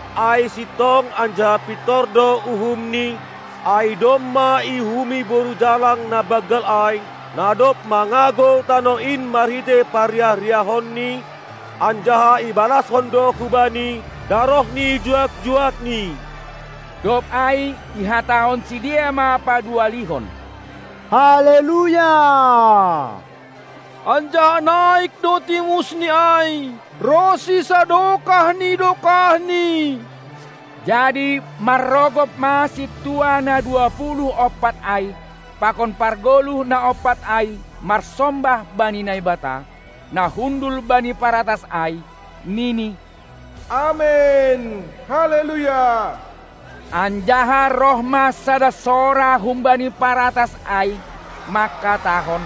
Ai sintong anjaha pintor do uhumni; ai domma iuhumi boru jalang na banggal ai, na dob mangagou tanoh in marhitei parriah-riahonni, anjaha ibalashon do hubani daroh ni juak-juakni Dob ai ihatahon sidea ma paduahalihon: Haleluya! Anjaha naik do timusni ai ronsi sadokah ni dokahni. Jadi manrogop ma sintua na dua puluh ompat ai pakon pargoluh na ompat ai marsombah bani Naibata, na hundul bani paratas ai, nini: Amen! Haleluya! Anjaha roh ma sada sora humbani paratas ai, mangkatahon: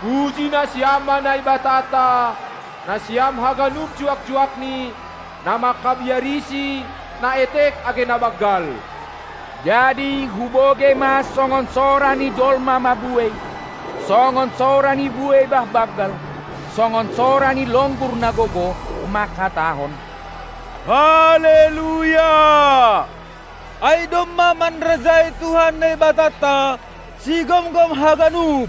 Puji nasiam ma Naibatanta, nasiam haganup juak-juakni, na mangkabiariSi, na etek age na banggal! Jadi hubogei ma songon sora ni jolma mabuei, songon sora ni buei bah banggal, songon sora ni longgur na gogoh, manghatahon: Haleluya! Ai domma manrajai Tuhan Naibatanta, Sigomgom haganup.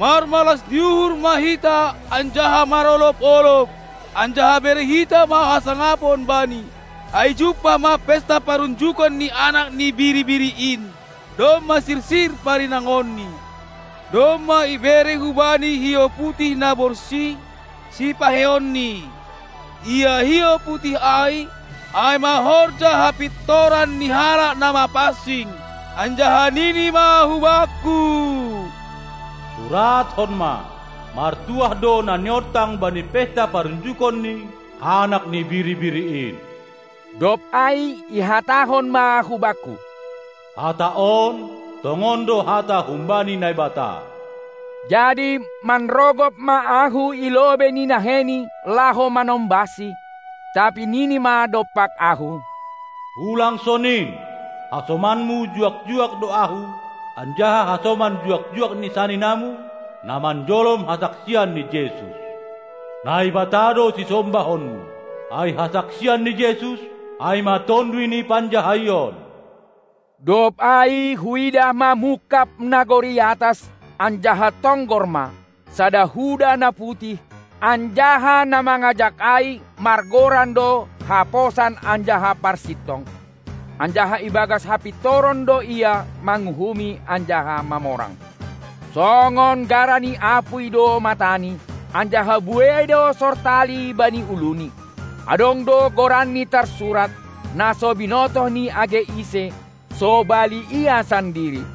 Marmalas ni uhur ma hita anjaha marolob-olob, anjaha bere hita ma hasangapon Bani! Ai jumpah ma pesta parunjukon ni Anak ni Biri-biri in, domma sirsir parinangonni. Domma ibere hubani hiou putih na borsih sipaheionni. Ia hiou putih ai, ai ma horja hapintoran ni halak na mapansing. Anjaha nini ma hubakku: Surathon ma: Martuah do na niontang bani pesta parunjukon ni Anak ni Biri-biri in. Dob ai ihatahon ma hubakku: Hata on tongon do hata humbani Naibata. Jadi manrogop ma ahu i lobei ni naheini laho manombahsi, tapi nini ma dompak ahu: Ulang sonin, hasomanmu juak-juak do ahu anjaha hasoman juak-juak ni saninamu, na manjolom hasaksian ni Jesus. Naibata do sisombahonmu! Ai hasaksian ni Jesus, ai ma tonduy ni panjahaion. Dob ai huidah ma mungkab nagori atas, anjaha tonggor ma, sada huda na putih, anjaha na mangajak ai margoran do Haposan anjaha Parsintong, anjaha ibagas hapintoron do Ia manguhumi anjaha mamorang. Songon gara ni apuy do matani, anjaha buei do sortali bani uluni; adong do goranni tarsurat, na so binotoh ni age ise, sobali Ia sandiri.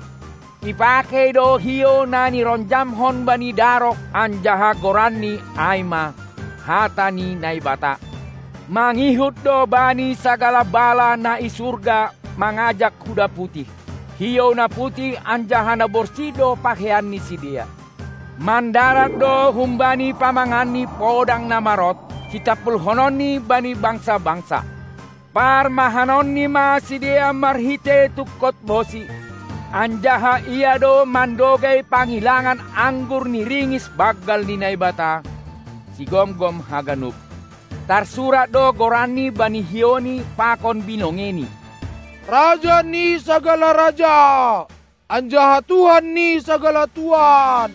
Ipakei do hiou na nironjamhon bani daroh anjaha goranNi ai ma: Hata ni Naibata. Mangihut do Bani sagala bala na i surga mangajak huda putih. Hiou na putih anjaha na borsih do pakeian ni sidea. Mandarat do humbani pamanganni podang na marot, sitampulhononni bani bangsa-bangsa. Parmahanonni ma sidea marhitei tungkot bosi, anjaha Ia do mandogei pangilangan anggur ni ringis banggal ni Naibata, Sigomgom haganup. Tarsurat do goranni bani hiouNi pakon binongeiNi: Raja ni sagala raja anjaha Tuhan ni sagala tuan.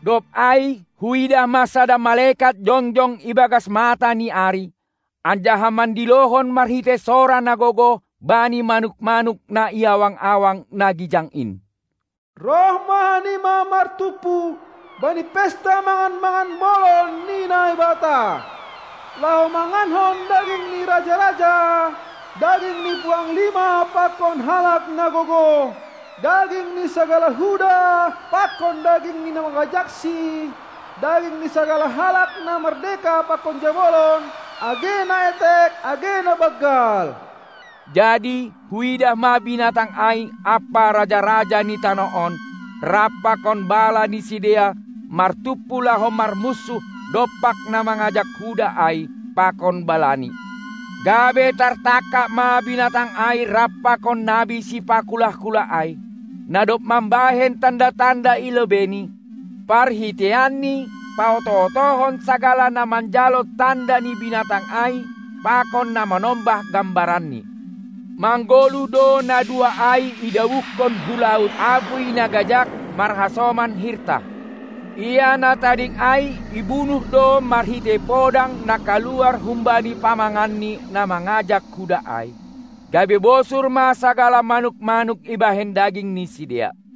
Dob ai huidah ma sada malekat jongjong ibagas mata ni ari, anjaha mandilohon marhitei sora na gogoh bani manuk-manuk na i awang-awang na gijang in: roh ma hanima martumpu bani pesta mangan-mangan bolon ni Naibata. laho manganhon daging ni raja-raja, daging ni puanglima pakon halak na gogoh, daging ni sagala huda pakon daging ni na mangajaksi, daging ni sagala halak na mardeka pakon jabolon, age na etek age na banggal. Jadi huidah ma binatang ai ampa raja-raja ni tanoh on rap pakon bala ni sidea martumpu laho marmunsuh dompak na mangajak huda ai pakon balani. Gabe tartangkap ma binatang ai rap pakon nabi sipakulah-kulah ai, na dob mambahen tanda-tanda i lobeini, parhiteianni paoto-otohon sagala na manjalo tanda ni binatang ai pakon na manombah gambaranni. Manggoluh do na dua ai idabuhkon hu laut apuy na gajag marhasoman hirtah. Ia na tading ai ibunuh do marhitei podang na kaluar humbani pamangan ni na mangajak huda ai, gabe bosur ma sagala manuk-manuk ibahen daging ni sidea.